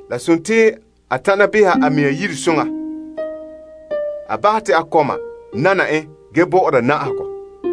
La dela a tana beha a mea yire soŋa, a bahɛ te a kɔma nana en ge bɔ'ɔra na'ahegɔ.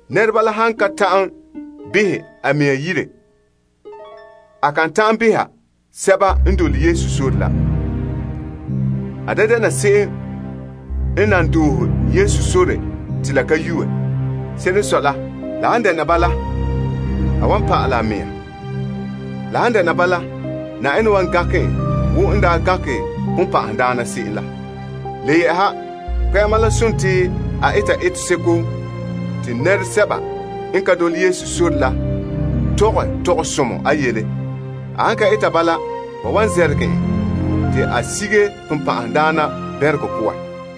Nɛra han ka ta'an beha a mɛŋa yire a kan ta'an behɛ Yenɛ lagaŋɔ. A da dɛna se'em n nan doohe Yesu sore te la ka yue. Se'ere n sɔe la, la han dɛna bala, a wan pa'alɛ a mɛŋa. La han dɛna bala, Yenɛ wan gankɛ en wo n daa gankɛ sagona la. Le yɛ'ɛha, kpɛ'ɛma la dela a eta eteseko te nɛresɛba n ka dole Yesu sore la tɔgɛ tɔgɔsomɔ a yele. A han ka eta bala, ba wan zɛrɛgɛ en te a sige sagona la bɛnregɔ poan.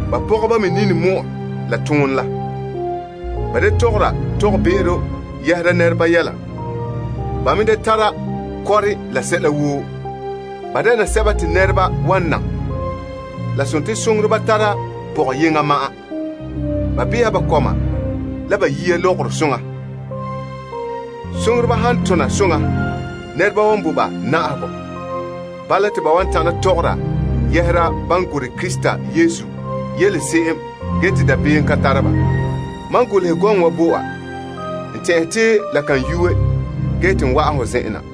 Ba pɔgɔba me la bɔŋa soŋa, da tɔgɔra tɔgɔbe'ero yɛhera nɛreba yele, da tara kɔre la sɛla woo ge me dɛna birikindoma. Lagaŋɔ soŋoreba tara pɔgɔyeŋɔ ma'an. Ba beha ba kɔma la ba yiya lɔgɔrɔ soŋa. Soŋoreba han tona soŋa, nɛreba wan bo ba na'ahegɔ. Bala, te ba wan tana tɔgɔra yɛhera ban gorɛ Krista Yesu yele se'em ge te dabeem ka tara ba. Mam golehɛ gɔŋɔ wa bo wa, n tɛn'ɛhe te la kan yuue ge wa'an ho zen'en na.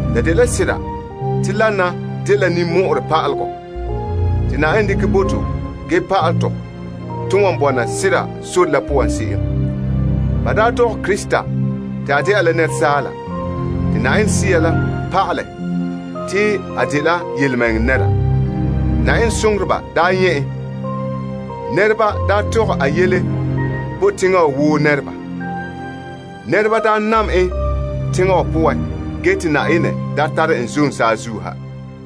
La dela sera te dena dela ninmɔ'ɔrɛ pa'alegɔ te Yenɛ dekɛ bo te ge pa'ala tɔ, to wan bɔna sera sore la poan se'em: Ba daa dɔgɛ Krista te a dɛna la asaala, te Yenɛ Sea la pa'alɛ te a dela yelemɛŋɛrɛ nɛra. Yenɛ soŋoreba daa nyɛ' en. Nɛreba daa tɔgɛ a yele bo teŋa wa woo nɛreba. Nɛreba daa nam en teŋa wa poan ge te Yenɛ daa tare en zom saazuo ha.